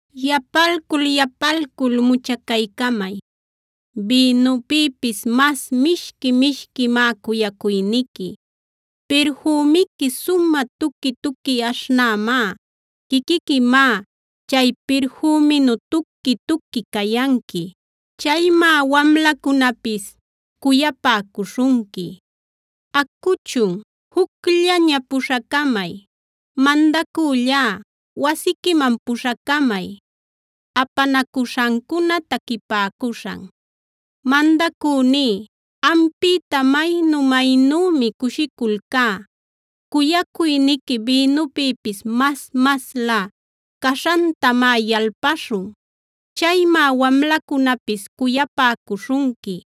Yapalcul-yapalcul muchacaycamay; bïnupïpis mas mishqui-mishquimá cuyacuyniqui. Pirfümiqui sumä tuqui-tuqui aśhnämá; quiquiquimá chay pirfüminu tuqui-tuqui cayanqui. Chaymá wamlacunapis cuyapäcuśhunqui. Acuchun, jucllaña puśhacamay. Mandacüllá, wasiquiman puśhacamay. Apanacuśhancuna taquipäcuśhan Mandacüní, ampïta maynu-maynümi cushiculcá; cuyacuyniqui bïnupïpis mas-maslä caśhantamá yalpaśhun. Chaymá wamlacunapis cuyapäcuśhunqui.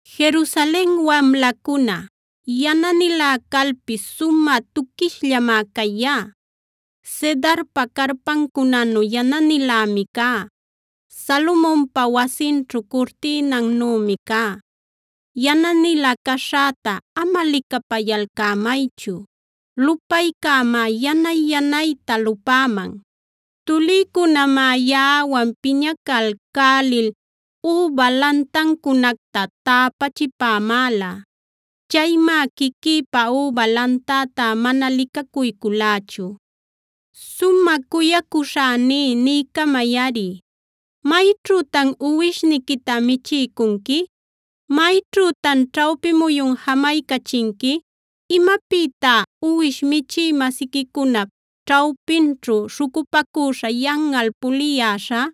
Jerusalen wamlacuna, yananilä calpis sumä tuquishllamá cayá, Cedarpa carpancunanub yananilämi cá, Salomonpa wasinćhu curtïnannümi cá. Yananilä caśhäta ama licapayalcämaychu; lupaycämá yanay-yanayta lupäman. Tulïcunamá yaꞌawan piñacalcälil üba lantancunacta täpachipämäla. Chaymá quiquïpa üba lantätá mana licacuyculächu. Sumä cuyacuśhäní niycamayꞌari, ¿mayćhütan uwishniquita michiycunqui? ¿Mayćhütan ćhawpi muyun jamaycachinqui? ¿Imapïtá uwish michï-masiquicunap ćhawpinćhu śhucupacüśha yanꞌal puliyäśhä?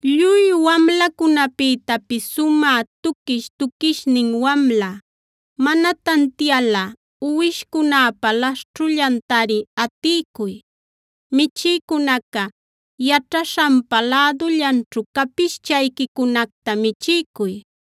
Lluy wamlacunapïtapis sumä tuquish-tuquishnin wamla, mana tantialꞌa uwishcunäpa laśhćhullantari atiycuy; michïcunaca yaćhaśhanpa lädullanćhu capischayquicunacta michiycuy.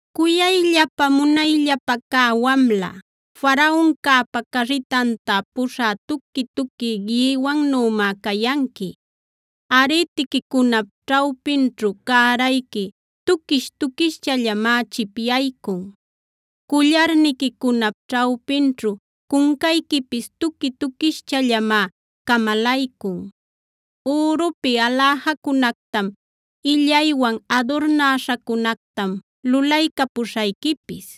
Cuyayllapä munayllapä cä wamla, Faraoncäpa carritanta puśhä tuqui-tuqui gïwannümá cayanqui. Arïtiquicunap ćhawpinćhu cärayqui tuquish-tuquischallamá chipyaycun. Cullarniquicunap ćhawpinćhu cuncayquipis tuqui-tuquischallamá camalaycun. Ürupi aläjacunactam, illaywan adurnäśhacunactam lulaycapuśhayquipis.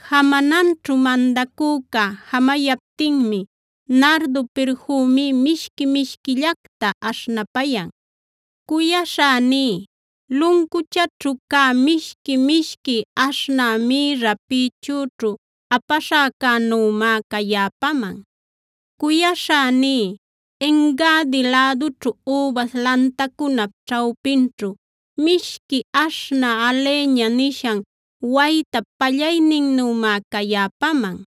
Jamananćhu mandacüca jamayaptinmi nardo pirfümí mishqui-mishquillacta aśhnapayan. Cuyaśhäní, luncuchaćhu cä mishqui-mishqui aśhnä mïrra pïchüćhu apaśhäcänümá cayäpaman. Cuyaśhäní, En-gadi lädućhu übas lantacunap ćhawpinćhu mishqui aśhnä alheña nishan waytap pallayninnümá cayäpaman.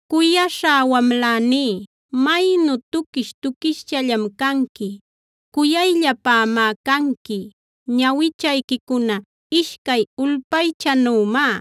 Cuyaśhá wamläní, maynu tuquish-tuquischallam canqui; cuyayllapämá canqui. Ñawichayquicuna ishcay ulpaychanümá.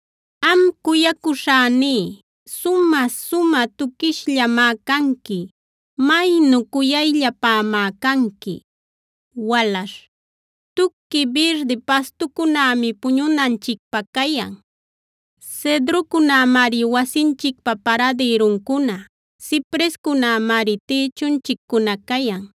Am cuyacuśhäní, sumä-sumä tuquishllamá canqui; maynu cuyayllapämá canqui. Walaśh Tuqui birdi pastucunämi puñunanchicpä cayan. Cedrocunämari wasinchicpa paradïruncuna; ciprescunämari tïchunchiccuna cayan.